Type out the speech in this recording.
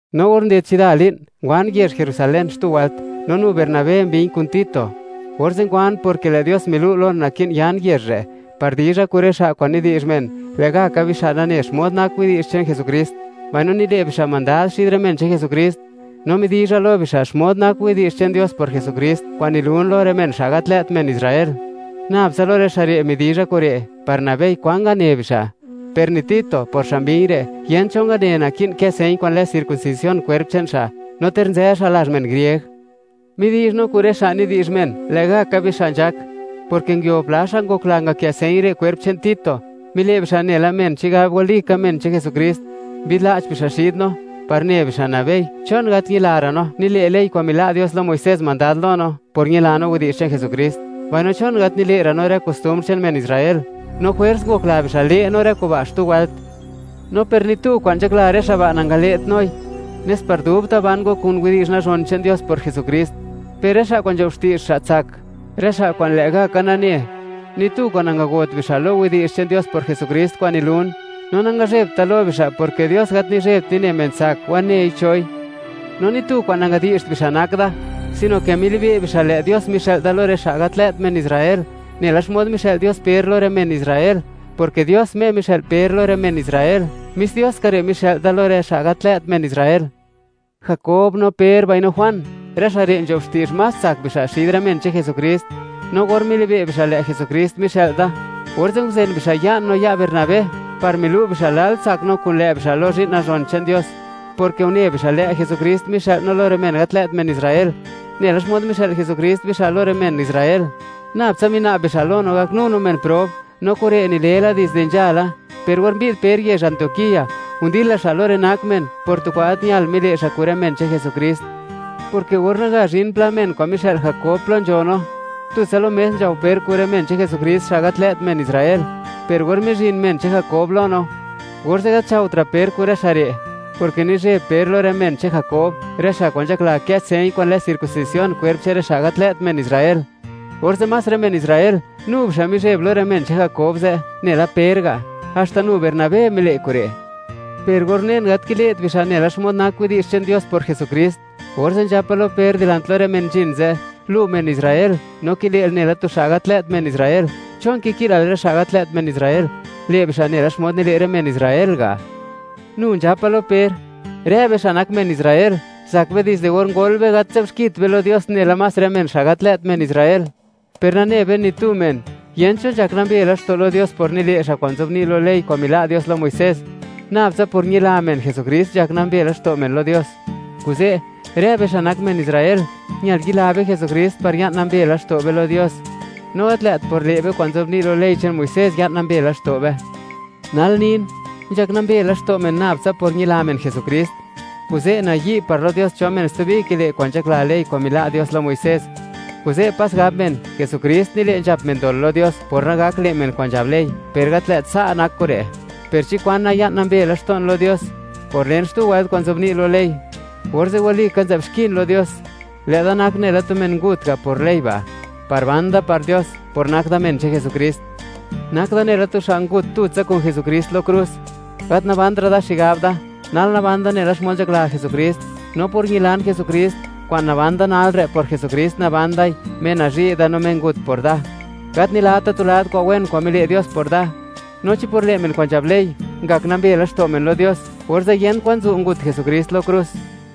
No or nded chida li'n, ngwan yezh Jerusalén xtu wëlt, no nu Bernabé mbi̱ñ kun Tito. Orze' ngwan, porke lë' Dios milu' lon, naki'n yan yezh re' par dizha kun rë xa' kwa'n nidi'zh men, lë' ga' ka bixa' nane xmod nak widi'zh che'n Jesukrist, mbaino nile' bixa' mandad xid rë men che'n Jesukrist. No midizha lo bixa', xmod nak widi'zh che'n Dios por Jesukrist kwa'n nilun lo rë men, xa' gat lë't men Israel. Nabtsa lo rë xa' re' midizha kure', par nabei, kwan ngane bixa'. Per ni Tito, por xa' mbi̱ñ re', yent cho ngane, naki'n kë señ kwa'n lë circuncisión kwerp che'n xa', no ter nzë xa' lazh men grieg. Midi'zh no kun rë xa' nidi'zh men, lë' gaka bixa' nzhak, porke nguio pla xa' ngokla ngakë señ re' kwerp che'n Tito. Mile' bixa' nela men chigab walika men che'n Jesukrist, mbi'dla'ch bixa' xid no, par ne bixa' nabei, ¿chon gat ñilara' no, nile' ley kwa'n mila' Dios lo Muisés mandad lo no?, por ñila no widi'zh che'n Jesukrist, mbaino, ¿chon gat nile'ra' no rë kostumbr che'n men Israel? No jwers ngokla bixa', le' no rë kuba' xtu wëlt. No per ni tu kwa'n nzhakla rë xa' ba', nangale't noi, nes par dubta' ban go kun widi'zh nazhon che'n Dios por Jesukrist. Per rë xa' kwa'n nzho'b xti'zh, xa' tsak, rë xa' kwa'n lë' gaka nane; ni tu kwa'n nangagot bixa' lo widi'zh che'n Dios por Jesukrist kwa'n nilun; no nangazhe'bt da lo bixa', porke Dios gat nizhe'bt nine men tsak, wanei choi. No ni tu kwa'n nangadi'zht bixa' nak da, sino ke milibe' bixa', lë' Dios mixë'l da lo rë xa' gat lë't men Israel, nela xmod mixë'l Dios Per lo rë men Israel, porke Dios Me mixë'l Per lo rë men Israel, mis Dios ka re' mixë'l da lo rë xa' gat lë't men Israel. Jakob, no Per, mbaino Juan, rë xa' re' nzho'b xti'zh más tsak bixa' xid rë men che'n Jesukrist. No or milibe' bixa' lë' Jesukrist mixë'l da, orze' nguzen bixa' ya'n no ya' Bernabé, par milu' bixa', lal tsak no kun lë' bixa' lo zhi'n nazhon che'n Dios, porke une bixa', lë' Jesukrist mixë'l no lo rë men gat lë't men Israel, nela xmod mixë'l Jesukrist bixa' lo rë men Israel. Nabtsa mina'b bixa' lo no, gaknu no men prob, no kure' nile la dizde nzhala. Per or mbi'd Per yezh Antioquía, ndila xa' lo rë nak men, por tu kwa'n gat ñal mile' xa' kun rë men che'n Jesukrist, porke or naga zhin pla men kwa'n mixë'l Jakob plo nzho no, tutsa lo mes nzhao Per kun rë men che'n Jesukrist xa' gat lë't men Israel. Per or mizhin men che'n Jakob lo no, orze' gat nzhaotra' Per kun rë xa' re', porke nizheb Per lo rë men che'n Jakob, rë xa' kwa'n nzhakla, kë' señ kwa'n lë circuncisión kwerp che'n rë xa' gat lë't men Israel. Orze', más rë men Israel, nu bixa' mizheb lo rë men che'n Jakob ze' nela Per ga'. Haxta nu Bernabé mile' kure'. Per or unen, gat kile't bixa' nela xmod nak widi'zh che'n Dios por Jesukrist, orze' nzhapa lo Per dilant lo rë men nzhin ze': “Lu men Israel, no kile'l nela tu xa' gat lë't tu men Israel. ¿Chon kiki'lal rë xa' gat lë't men Israel, le' bixa' nela xmod nile' rë men Israel ga'?” Nu nzhapa lo Per: “Rë be, xa' nak men Israel, zak be dizde or ngol be, gat nzë'bt xkit be lo Dios nela más rë men xa' gat lë't men Israel. Per nane be, ni tu men, yent cho nzhak nambe laxto' lo Dios por nile' xa' kwa'n nzobni' lo ley kwa'n mila' Dios lo Muisés. Nabtsa por ñila men Jesukrist nzhak nambe laxto' men lo Dios. Kuze', rë be xa' nak men Israel, ñal yila be Jesukrist, par ña'n nambe laxto' be lo Dios, no gat lë't por le' be kwa'n nzobni' lo ley che'n Muisés ya'n nambe laxto' be.” Nal nin, nzhak nambe laxto' men nab tsa por ñila men Jesukrist. Kuze', nayi' par lo Dios cho men stubi kile' kwa'n nzhakla ley kwa'n mila' Dios lo Muisés. Kuze', pas gab men, Jesukrist nile' nzhap men dol lo Dios, por nagak le' men kwa'n nzhab ley. ¡Per gat lë't sa' nak kure'! Per chi kwana, ya'n nambe laxto'n lo Dios por len xtu wëlt kwa'n nzobni' lo ley, ¡orze' walika nzë'b xkin lo Dios! Lë'da nak nela tu men ngut ga' par ley ba', par ban da par Dios, por nak da men che'n Jesukrist. Nak da nela tu xa' ngut tutsa kun Jesukrist lo krus; gat nabantra' da xigab da; nal naban da nela xmod nzhakla Jesukrist. No por ñilan Jesukrist, kwa'n naban da nal re', por Jesukrist naban dai, Me nazhi' da, no Me ngut por da. Gat nilata' tu lad kwa'n wen kwa'n mile' Dios por da, no chi por le' men kwa'n nzhab ley, ngak nambe laxto' men lo Dios, ¡orze' yent kwan zu' ngut Jesukrist lo krus!